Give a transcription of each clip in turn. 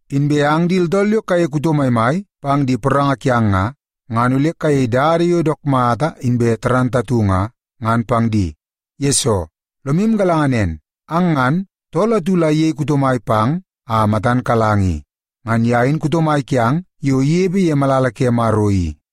Inbe ang di tooltool yo kayei kuto maimai pang di poranga kiang nga, ngan ole kayei dada yo dook mata inbe moolmool nga, ngan pang di. Yesoo, lomu galanga nen, ang ngan, tool atu la iyei kuto mai pang a matan kalang i. Ngan ye in kuto mai kiang yo inepe ye malala ke Maro i.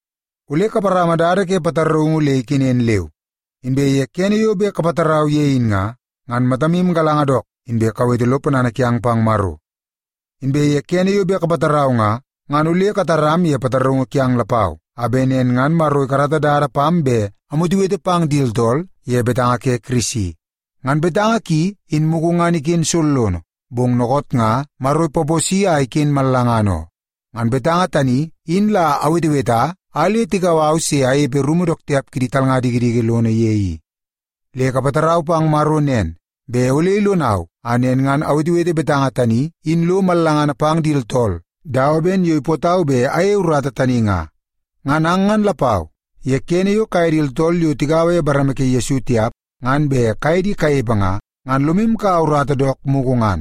Ole kaparama dada ke pataraungu le ikenen leu. Inbe kene yo bet kapatarau ye in nga, ngan matamu galanga dook, inbe kawete lo ponana kiang pang Maro. Inbe ye kene yo bet kapatarau nga, ngan ole kataram ye pataraungu kiang lapau, a bet nen ngan Maro ikarata dada pam bet amwetewete pang di tooltool ye betanga ke Kirisi. Ngan betanga ki in mugu ngan iken sollono, bong dookoot nga Maro ipaposi a iken mallangana oo. Ngan betanga tani in la aweteweta a le tikau au se anepe rumu dook tiap kidi talnga dikidiki lono ye i. Le kapatarau pang Maro nen, bet ole ilonau a nen ngan awetewete betanga tani in lo mallangana pang di tooltool dawa ben yo ipootau bet ayeie urata tani nga. Ngan ang ngan lapau, ye kene yo kaye di tooltool yo tigaua ye bareme ke Yesu tiap ngan bet kaye di kanepe nga, ngan lomu kaua urata dook mugu ngan,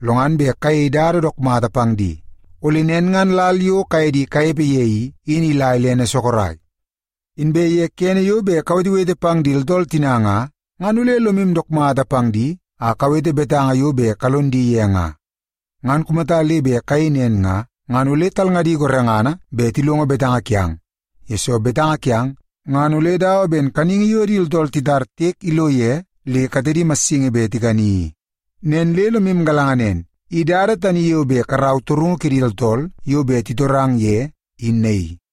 lo ngan bet kayei dada dook mata pang di. Ole nen ngan lal yo kaye di kanepe ye i, in ila ilene sorok. Inbe ye kene yo bet kawetewete pang di tooltool tina nga, ngan ole lomu dook mata pang di a kawete betanga yo bet kalon di ye nga. Ngan kumata le bet kayei nen nga, ngan ole talngadi gorengana bet tilongo betanga kiang, yesoo betanga kiang ngan ole dawa ben kaningi yo di tooltool titar tiek ilo ye le katedi massingi bet tikani i. Nen le lomu galanga nen, i dada tani yo bet karau torungu ke di tooltool yo bet titorang ye, in naii.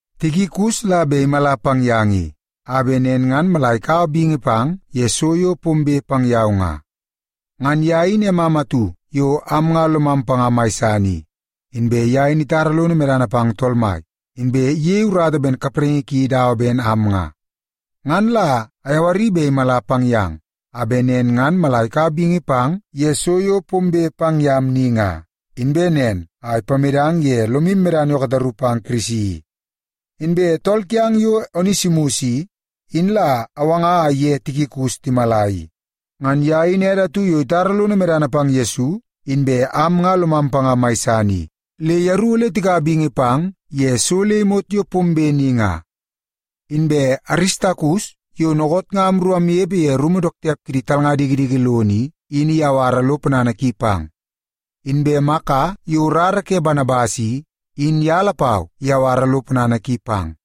Tikikus la bet imala pang yang i, a bet nen ngan mala ikaua bingi pang ye so yo pombe pang yau nga. Ngan ye in emam atu yo am nga lomam panga mai san i. Inbe ye in itara lono medana pang Tool Mai, inbe iyei urata ben kapraingi ki dawa ben am nga. Ngan la ayawari bet imala pang yang, a bet nen ngan mala ikaua bingi pang ye so yo pombe pang yam ni nga, inbe nen a ipamedang ye lomu medana yo kataru pang Kirisi i. Inbe tool kiang yo Onesimus i, in la awanga a iye Tikikus timala i. Ngan ye in ede atu yo itara lono medana pang Yesu, inbe am nga lomam panga mai san i. Le yeru ole tikaua bingi pang ye so le imot yo pombe ni nga. Inbe Aristakus yo dookoot nga amru amnepe ye rumu dook tiap kidi talnga dikidiki lono i, in iyawara lo ponana ki pang. Inbe Maka yo rara ke Banabas i, in ye lapau iyawara lo ponana ki pang.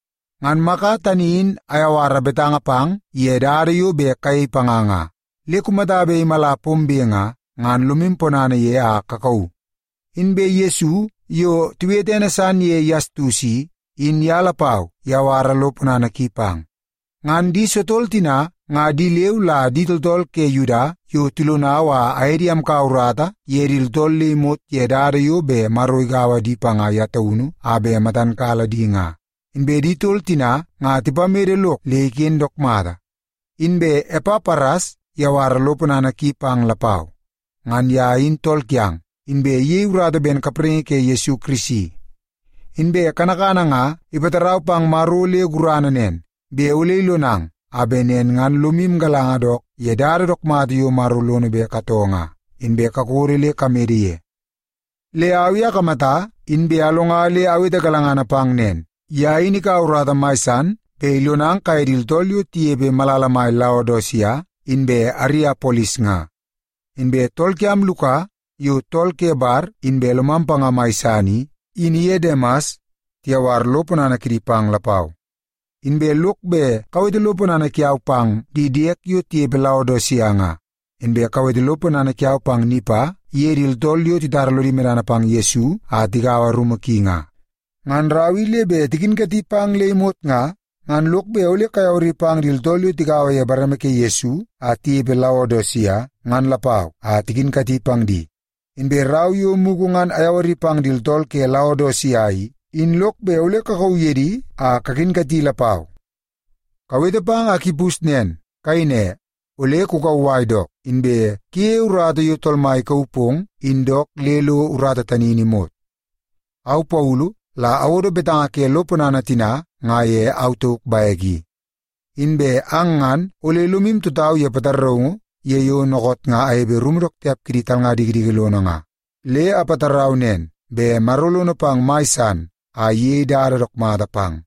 Ngan Maka tani in ayawara betanga pang ye dada yo bet kayei panga nga. Le kumata bet imala pombe nga, ngan lomu ponana ye a kakauu. Inbe Yesu, yo tiwete ene san ye Yastus i, in ye lapau iyawara lo ponana ki pang. Ngan di sotol tina nga di leu la di tooltool ke Yuda yo tilonau a aye di amkaua urata ye di tooltool le imot ye dada yo bet Maro igaua di panga ye taunu a bet matan kala di nga. Inbe di tol tina nga tipamede lok le iken dook mata. Inbe Epapras iyawara lo ponana ki pang lapau. Ngan ye in tool kiang, inbe iyei urata ben kapraingi ke Yesu Kirisi. Inbe kanakana nga ipatarau pang Maro le gurana nen, bet ole ilonang a bet nen ngan lomu galanga dook ye dada dook mata yo Maro lono bet katoo nga, inbe kakodo le kamede ye. Le au i akamata inbe alonga le awete galangana pang nen, ye in ikaua urata mai san bet ilonang kaye di tooltool yo tinepe malala mai Laodisia inbe Ariapolis nga. Inbe tool kiam Luka, yo tool ke bar inbe lomam panga mai san i, in iye Demas tiyawar lo ponana kidi pang lapau. Inbe lok bet kawete lo ponana kiau pang di diede yo tinepe Laodisia nga. Inbe kawete lo ponana kiau pang Nimpa iye di tooltool yo titara lodi medana pang Yesu a tigaua rumu ki nga. Ngan rau i le bet tikinkati pang le imot nga, ngan lok bet ole kayawari pang di tooltool yo tigaua ye bareme ke Yesu a tinepe Laodisia ngan lapau a tikinkati pang di. Inbe rau yo mugu ngan ayawari pang di tooltool ke Laodisia i, in lok bet ole kakauu ye di a kakinkati lapau. Kawete pang Akipus nen, kayei ne, “Ole kukauwai dook, inbe kuyeie urata yo Tool Mai ikauu pong in dook le lo urata tani in imot.” Au Paulu la awodo betanga ke lo ponana tina nga ye au tauk bek i. Inbe ang ngan ole lomu tutau ye pataraungu ye yo dookoot nga anepe ye rumu dook tiap kidi talnga dikidiki lono nga. Le apatarau nen, bet Maro lono pang mai san a iyei dada dook mata pang.